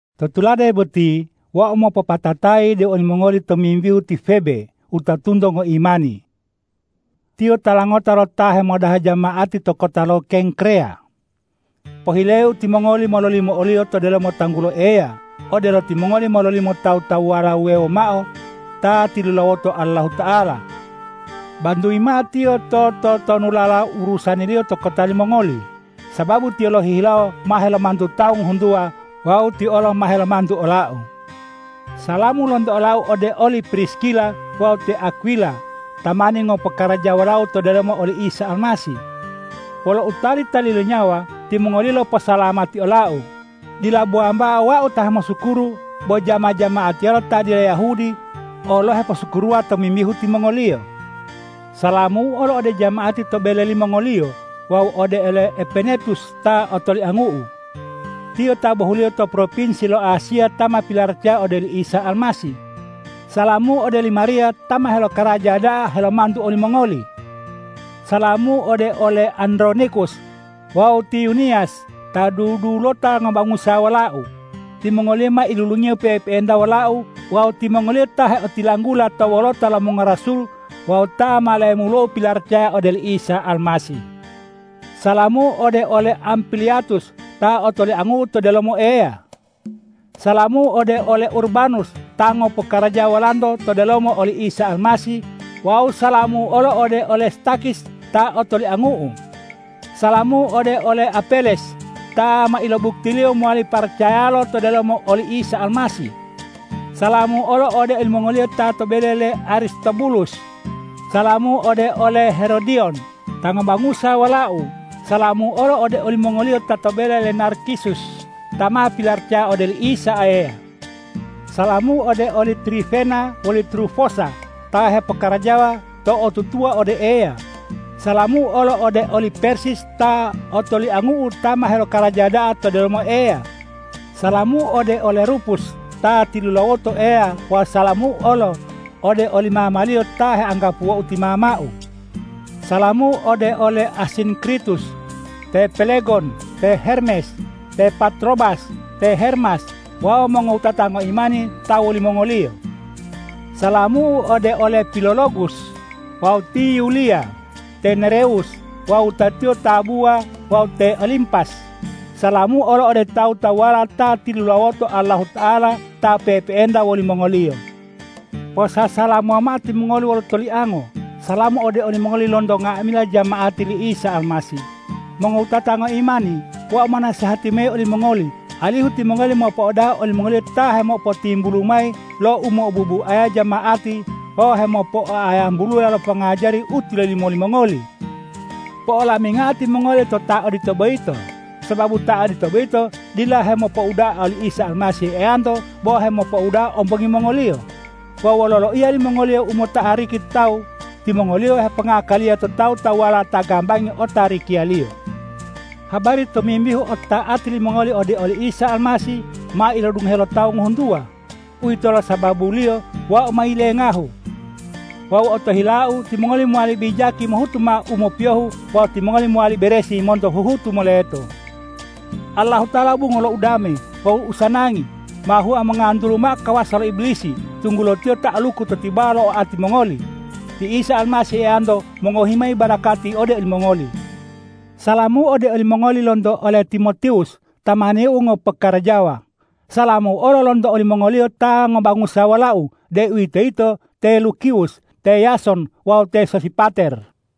To tulade boti wau mopopatatayi ode olimongoli tomimbihu ti Febe wutatunto ngoimani. Tiyo tala ngota lo ta hemodaha jama'ati to kota lo Kengkreya. Pohileu timongoli mololimo oliyo to delomo tanggulo Eya, odelo timongoli mololimo tawu-tawuwala wuwewo mao ta tilulawoto Allahuta'ala. Bantuyi mao tiyo to totonulala urusaniliyo to kota limongoli, sababu tiyo lohihilawo ma helomantu tawu ngohuntuwa wawu tiyo olo ma helomantu olau. Salamu lonto olau ode oli Priskila wawu te Akwila, tamani ngopokarajawa wolau to delomo oli Isa Almasih. Wolo utali-tali lo nyawa timongoliyo loposalamati olau. Dila bo wambao wau ta hemosukuru bo jama-jama'atiyala ta dila Yahudi olo heposukuruwa tomimbihu timongoliyo. Salamu'u olo ode jama'ati to bele limongoliyo wawu ode ole Epenetus ta otoliangu'u. Tiyo ta bohuliyo to propinsi lo Asiya ta ma pilaracaya ode oli Isa Almasih. Salamu'u ode li Mariya ta ma helokaraja da'a helomantu olimongoli. Salamu'u ode ole Andronikus wawu ti Yuniyas ta dudulota ngobangusa wolau. Timongoliyo ma ilulungiyo pe'e-pe'enta wolau wawu timongoliyo ta heotilanggula to wolota lo mongorasul wawu ta ma lemulou pilaracaya ode oli Isa Almasih. Salamu'u ode ole Ampliatus ta otoliangu'u to delomo Eya. Salamu'u ode ole Urbanus ta ngopokarajawa wolanto to delomo oli Isa Almasih wawu salamu'u olo ode ole Stakhis ta otoliangu'u. Salamu'u ode ole Apeles ta ma ilobuktiliyo mowali paracayalo to delomo oli Isa Almasih. Salamu'u olo ode olimongoliyo ta to bele le Aristobulus. Salamu'u ode ole Herodiyon ta ngobangusa wolau. Salamu'u olo ode olimongoliyo ta to bele le Narkisus ta ma pilaracaya ode oli Isa Eya. Salamu'u ode oli Trifena woli Trufosa ta hepokarajawa to'otutuwa ode Eya. Salamu'u olo ode oli Persis ta otoliangu'u ta ma helokaraja da'a to delomo Eya. Salamu'u ode ole Rupus ta tilulawoto Eya wawu salamu'u olo ode oli mamaliyo ta heanggapuwou ti mamau. Salamu'u ode ole Asinkritus, te Pelegon, te Hermes, te Patrobas, te Hermas wawu mongowutata ngoimani ta wolimongoliyo. Salamu'u ode ole Pilologus wawu ti Yuliya, te Nerewus wawu wutatiyo tabuwa wawu te Olimpas. Salamu'u olo ode tawu-tawuwala ta tilulawoto Allahuta'ala ta pe'epe'enta wolimongoliyo. Posasalamuwa mao timongoli wolo toliango. Salamu ode olimongoli lonto nga'amila jama'ati li Isa Almasih. Mongowutata ngoimani, wau monasehati mayi olimongoli alihu timongoli mopo'odaha olimongoliyo ta hemopotimbulu mayi lo umo'obuaya jama'ati wawu hemopoa'ayambulula lo pongajari u ma tilolimo limongoli. Po'olamingao timongoli to ta odito boyito, sababu ta odito boyito dila hemopouda'a oli Isa Almasih Eyanto bo hemopouda'a ombongi mongoliyo. Wawu wolo loiya limongoliyo u mo'otariki to tawu, timongoliyo hepongakaliya to tawu-tawuwala ta gambangi otarikiyaliyo. Habari tomimbihu otota'ati limongoli ode oli Isa Almasih, ma ilodungohe lo tawu ngohuntuwa. Uwitolo sababuliyo wau ma yilengahu. Wawu otohilau timongoli mowali bijaki mohutu mao u mopiyohu wawu timongoli mowali beresi monto huhutu moleto. Allahuta'ala bungo lo udame wawu usanangi ma hua mongantulu mao kawasa lo Ibilisi, tunggulo tiyo ta'aluku to tibawa lo oati mongoli. Ti Isa Almasih Eyanto mongohi mayi barakati ode olimongoli. Salamu ode olimongoli lonto ole Timotiwus tamaniu ngopokarajawa. Salamu olo lonto olimongoliyo ta ngobangusa wolau, deuwitoyito te Lukiwus, te Yason wawu te Sosipater.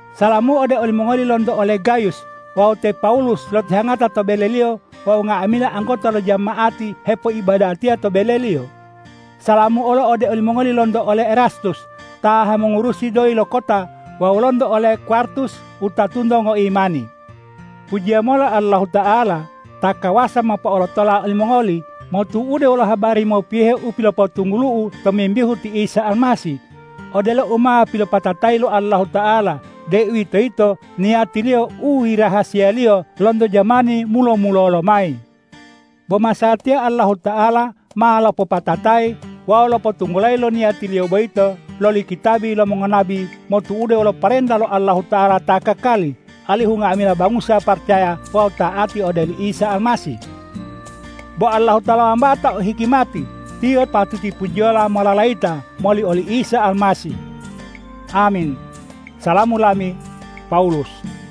Salamu ode olimongoli lonto ole Gayus. Wau te Pawulus lotihangata to beleliyo wawu nga'amila anggota lo jama'ati hepoibadatiya to beleliyo. Salamu olo ode olimongoli lonto ole Erastus ta hemongurusi doyi lo kota wawu lonto ole Kwartus wutatunto ngoimani. Pujiya mola Allahuta'ala ta kawasa mopo'olotola olimongoli motu'ude wolo habari mopiyohe u pilopotunggulu'u tomimbihu ti Isa Almasih, odelo u ma pilopopatatayi lo Allahuta'ala, deuwitoyito niyati-Liyo u yirahasiya-Liyo lonto jamani mulo-mulolo lomayi. Bo masatiya Allahuta'ala ma lopopatatayi wawu lopotunggulayi lo niyati-Liyo boyito loli kitabi lo mongonabi motu'ude wolo parenta lo Allahuta'ala ta kakali, alihu nga'amila bangusa paracaya wawu ta'ati ode oli Isa Almasih. Bo Allahuta'ala wambao ta o hikimati. Tiyo patuti pujiyola mololayita moli oli Isa Almasih! Amin. Salamu lami, Pawulus